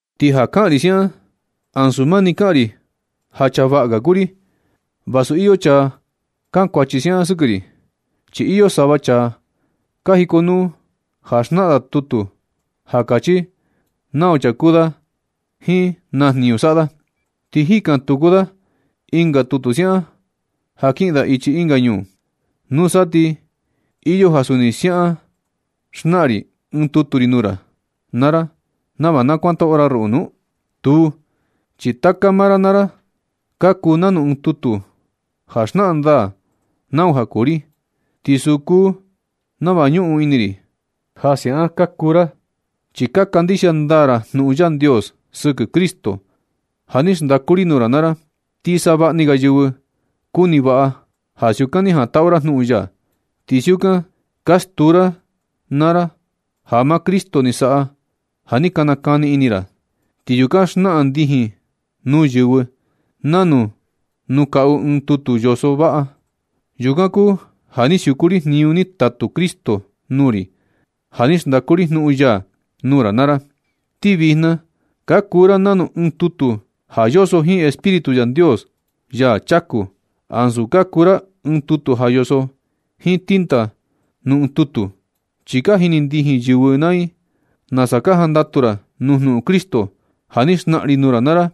Ti ja kaꞌan ri siaꞌan, ansu mani kaꞌan ri ja chaa vaꞌa ga kuu ri, vasu iyo chaa ka kankuachi siaꞌan sɨkɨ ri. Chi iyo sava chaa ka jikonuu ja xnaꞌan da tutu ja kachi nau chaa kuu da jiin na jniñu saꞌa da, ti jikan tuku da ɨnga tutu siaꞌan ja kiꞌin da ichi ɨnga ñuu. ¿Nusa ti iyo ja suni siaꞌan xnaꞌan ri ɨɨn tutu ri nuu ra naa ra nava na kuantaꞌu ra ruꞌu nu? Tuu, chi taka maa ra naa ra ka kuu nanu ɨɨn tutu ja xnaꞌan ndaa nau ja kuu ri. Ti suu kuu nava ñuꞌun ini ri ja siaꞌan ka kuu ra, chi ka kandixia ndaa ra jnuꞌun Yandios sɨkɨ Cristo ja ni xndaku ri nuu ra naa ra. Ti savaꞌni ga yɨvɨ kuni vaꞌa i ja siukan ni jantaꞌu ra jnuꞌun ya. Ti siukan ka stuu ra naa ra ja maa Cristo ni saꞌa ja ni ka nakani ini ra, ti yukan xnaꞌan ndijin nuu yɨvɨ nanu nuu kaꞌu i ɨɨn tutu yoso vaꞌa. Yukan kuu ja ni siuku ri jniñu ni tatu Cristo nuu ri ja ni xndaku ri jnuꞌun ya nuu ra naa ra. Ti vijna ka kuu ra nanu ɨɨn tutu ja yoso jiin Espíritu Yandios, Yaa chaku, ansu ka kuu ra ɨɨn tutu ja yoso jiin tinta nuu ɨɨn tutu. Chi ka jini ndijin yɨvɨ naa i nasa ka jandatu ra nuu jnuꞌun Cristo ja ni xnaꞌan ri nuu ra naa ra.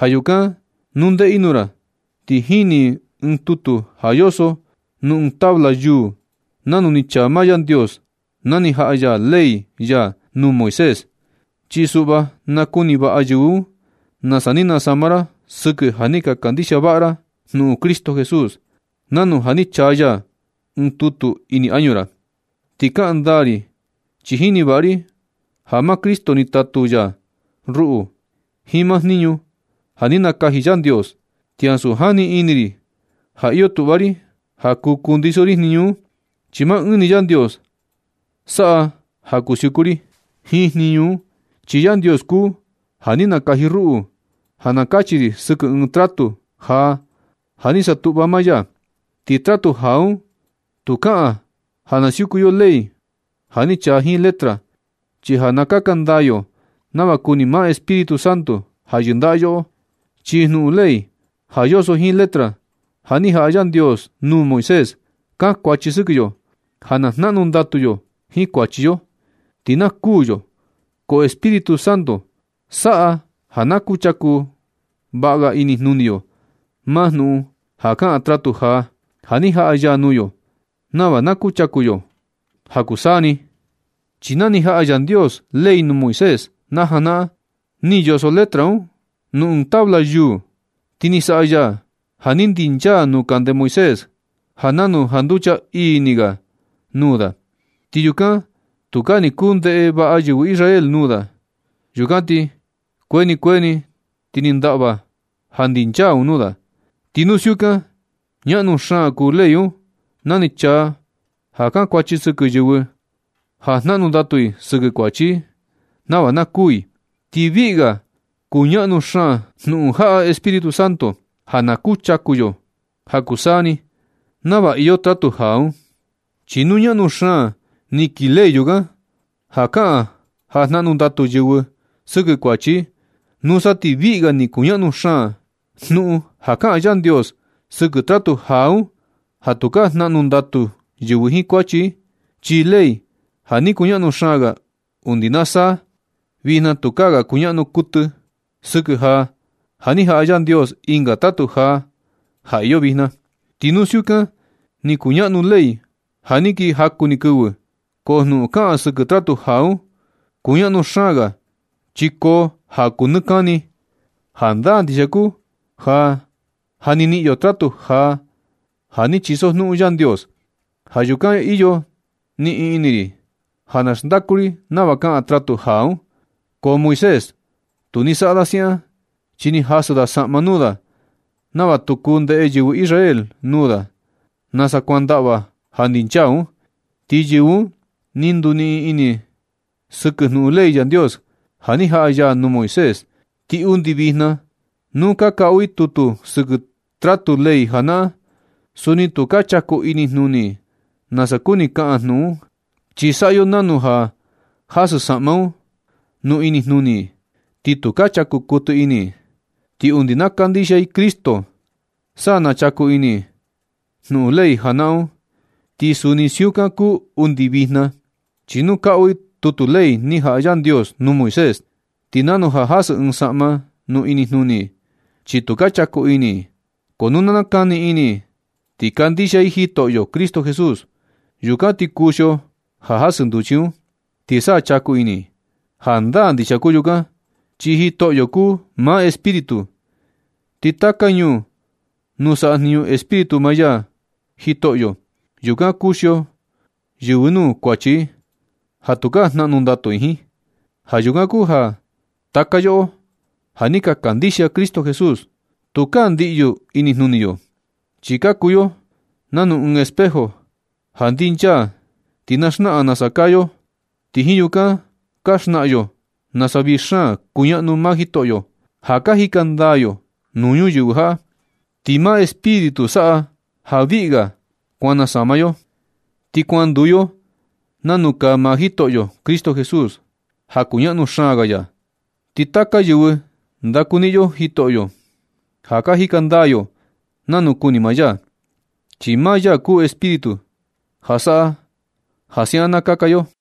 Ja yukan nu ndeꞌe i nuu ra, tu jini i ɨɨn tutu ja yoso nuu ɨɨn tabla yuu nanu ni chaa maa Yandios, na ni jaꞌa ya ley ya nuu Moisés. Chi suꞌva nakuni vaꞌa yɨvɨ un nasa ni nasama ra sɨkɨ ja ni ka kandixia vaꞌa ra jnuꞌun Cristo Jesús, nanu ja ni chaa ya ɨɨn tutu ini añu ra. Ti kaꞌan ndaa, ri chi jini vaꞌa ri ja maa Cristo ni tatu ya ruꞌu jiin maa jniñu ja ni nakaji Yandios. Ti ansu jani ini ri ja iyo tuꞌva ri ja kuu kundiso ri jniñu un. Chi maa ɨɨn ni Yandios saꞌa ja kuu siuku ri jiin jniñu un. Chi Yandios kuu ja ni nakaji ruꞌu ja na kachi ri sɨkɨ ɨɨn tratu jaa ja ni satuꞌva maa ya. Ti tratu jaa un, tu kaꞌan ja na siuku yo ley ja ni chaa jiin letra, chi ja na kaka ndaa yo nava kuni maa Espíritu Santo ja yɨndaꞌa yoꞌo. Chi jnuꞌun ley ja yoso jiin letra, ja ni jaꞌa Yandios nuu Moisés, kankuachi sɨkɨ yo ja na jnaꞌnu ndatu yo jiin kuachi yo, ti na kuū yo. Ko Espíritu Santo saꞌa ja na chaku vaꞌa ga inijnuni yo maa jnuꞌun ja kaꞌan tratu jaa, ja ni jaꞌa ya nuu yo nava na kuchaku yo ja kuu taka saa ni. Chi na ni jaꞌa Yandios ley nuu Moisés na janaꞌan, ni yoso letra un nuu ɨɨn tabla yuu. Ti ni saꞌa ya ja ni ndinchaa nuu kande Moisés ja nanu janducha ii ni ga nuu da. Ti yukan tukaa ni kuu ndeꞌe vaꞌa yɨvɨ Israel nuu da. Yukan ti kuee ni kuee ni ti ni ndaꞌva ja ndinchaa un nuu da. Ti nu siukan, ñaꞌnu xaan kuu ley un na ni chaa ja kankuachi sɨkɨ yɨvɨ ja jnaꞌnu ndatu i sɨkɨ kuachi i nava na kuū i. Ti viꞌi ga kuñaꞌnu xaan jnuꞌun jaꞌa Espíritu Santo ja na kuchaku yo saa ni nava iyo tratu jaa un. Chi nu ñaꞌnu xaan ni kii ley yukan, ja kaꞌan ja jnaꞌnu ndatu yɨvɨ sɨkɨ kuachi i, nusa ti viꞌi ga ni kuñaꞌnu xaan jnuꞌun ja kaꞌan Yandios sɨkɨ tratu jaa un ja tukaa jnaꞌnu ndatu yɨvɨ jiin kuachi i. Chi ley ja ni kuñaꞌnu xaan ga undi na saa, vijna tukaa ga kuñaꞌnu kuɨtɨ sɨkɨ ja ja ni jaꞌa Yandios ɨnga tratu jaa ja iyo vijna. Ti nu siukan ni kuñaꞌnu ley ja ni kii jaku ni kɨvi, ko jnuꞌun kaꞌan sɨkɨ tratu jaa un kuñaꞌnu xaan ga chi koo ja kuu nɨ kani. Jandaa ndixia kuu ja ja ni niꞌin yo tratu jaa ja ni chisojnuꞌun Yandios. Ja yukan iyo niꞌin ini ri ja na xndaku ri nava kaꞌan tratu jaa un. Ko Moisés, tu ni saꞌa da siaꞌan, chi ni jasɨ da saꞌma nuu da nava tu kuu ndeꞌe yɨvɨ Israel nuu da nasa kuan ndaꞌva ja ndinchaa un. Ti yɨvɨ un ni nduniꞌin ini i sɨkɨ jnuꞌun ley Yandios ja ni jaꞌa ya nuu Moisés. Ti undi vijna nu ka kaꞌu i tutu sɨkɨ tratu ley janaꞌan, suni tu ka chaku inijnuni i nasa kuni kaꞌan jnuꞌun un, chi saꞌa yo nanu ja jasɨ saꞌma un nuu inijnuni i, ti tu ka chaku kuɨtɨ ini i. Ti undi na kandixia i Cristo, sa na chaku ini i jnuꞌun ley janaꞌan un. Ti suni siukan kuu undi vijna, chi nu kaꞌu i tutu ley ni jaꞌa Yandios nuu Moisés, ti nanu ja jasɨ ɨɨn saꞌma nuu inijnuni i, chi tu ka chaku ini i. Ko nu na nakani ini i ti kandixia i Jitoꞌyo Cristo Jesús, yukan ti kuxio ja jasɨ nduchi i un, ti sa chaku ini i. Jandaa ndixia kuu yukan, chi Jitoꞌyo kuu maa Espíritu, ti taka ñuu nuu saꞌa jniñu Espíritu maa Jitoꞌyo, yukan kuxio yɨvɨ nuu kuachi i ja tukaa jnaꞌnu ndatu i jiin. Ja yukan kuu ja taka yoꞌo ja ni ka kandixia Cristo Jesús, tukaa ndiꞌyu inijnuni yo. Chi ka kuu yo nanu ɨɨn espejo ja ndinchaa ti na xnaꞌan nasa kaa yo, ti jiin yukan ka xnaꞌan yo nasa vii xaan kuñaꞌnu maa Jitoꞌyo ja ka jika ndaa yo nuu ñuyɨvɨ jaꞌa. Ti maa Espíritu saꞌa ja viꞌi ga kuan nasama yo, ti kuan nduu yo nanu kaa maa Jitoꞌyo Cristo Jesús ja kuñaꞌnu xaan ya. Ti taka kɨvɨ ndakuniꞌin yo Jitoꞌyo ja ka jika ndaa yo nanu kuni maa ya, chi maa ya kuu Espíritu ja saꞌa ja siaꞌan na kaka yo.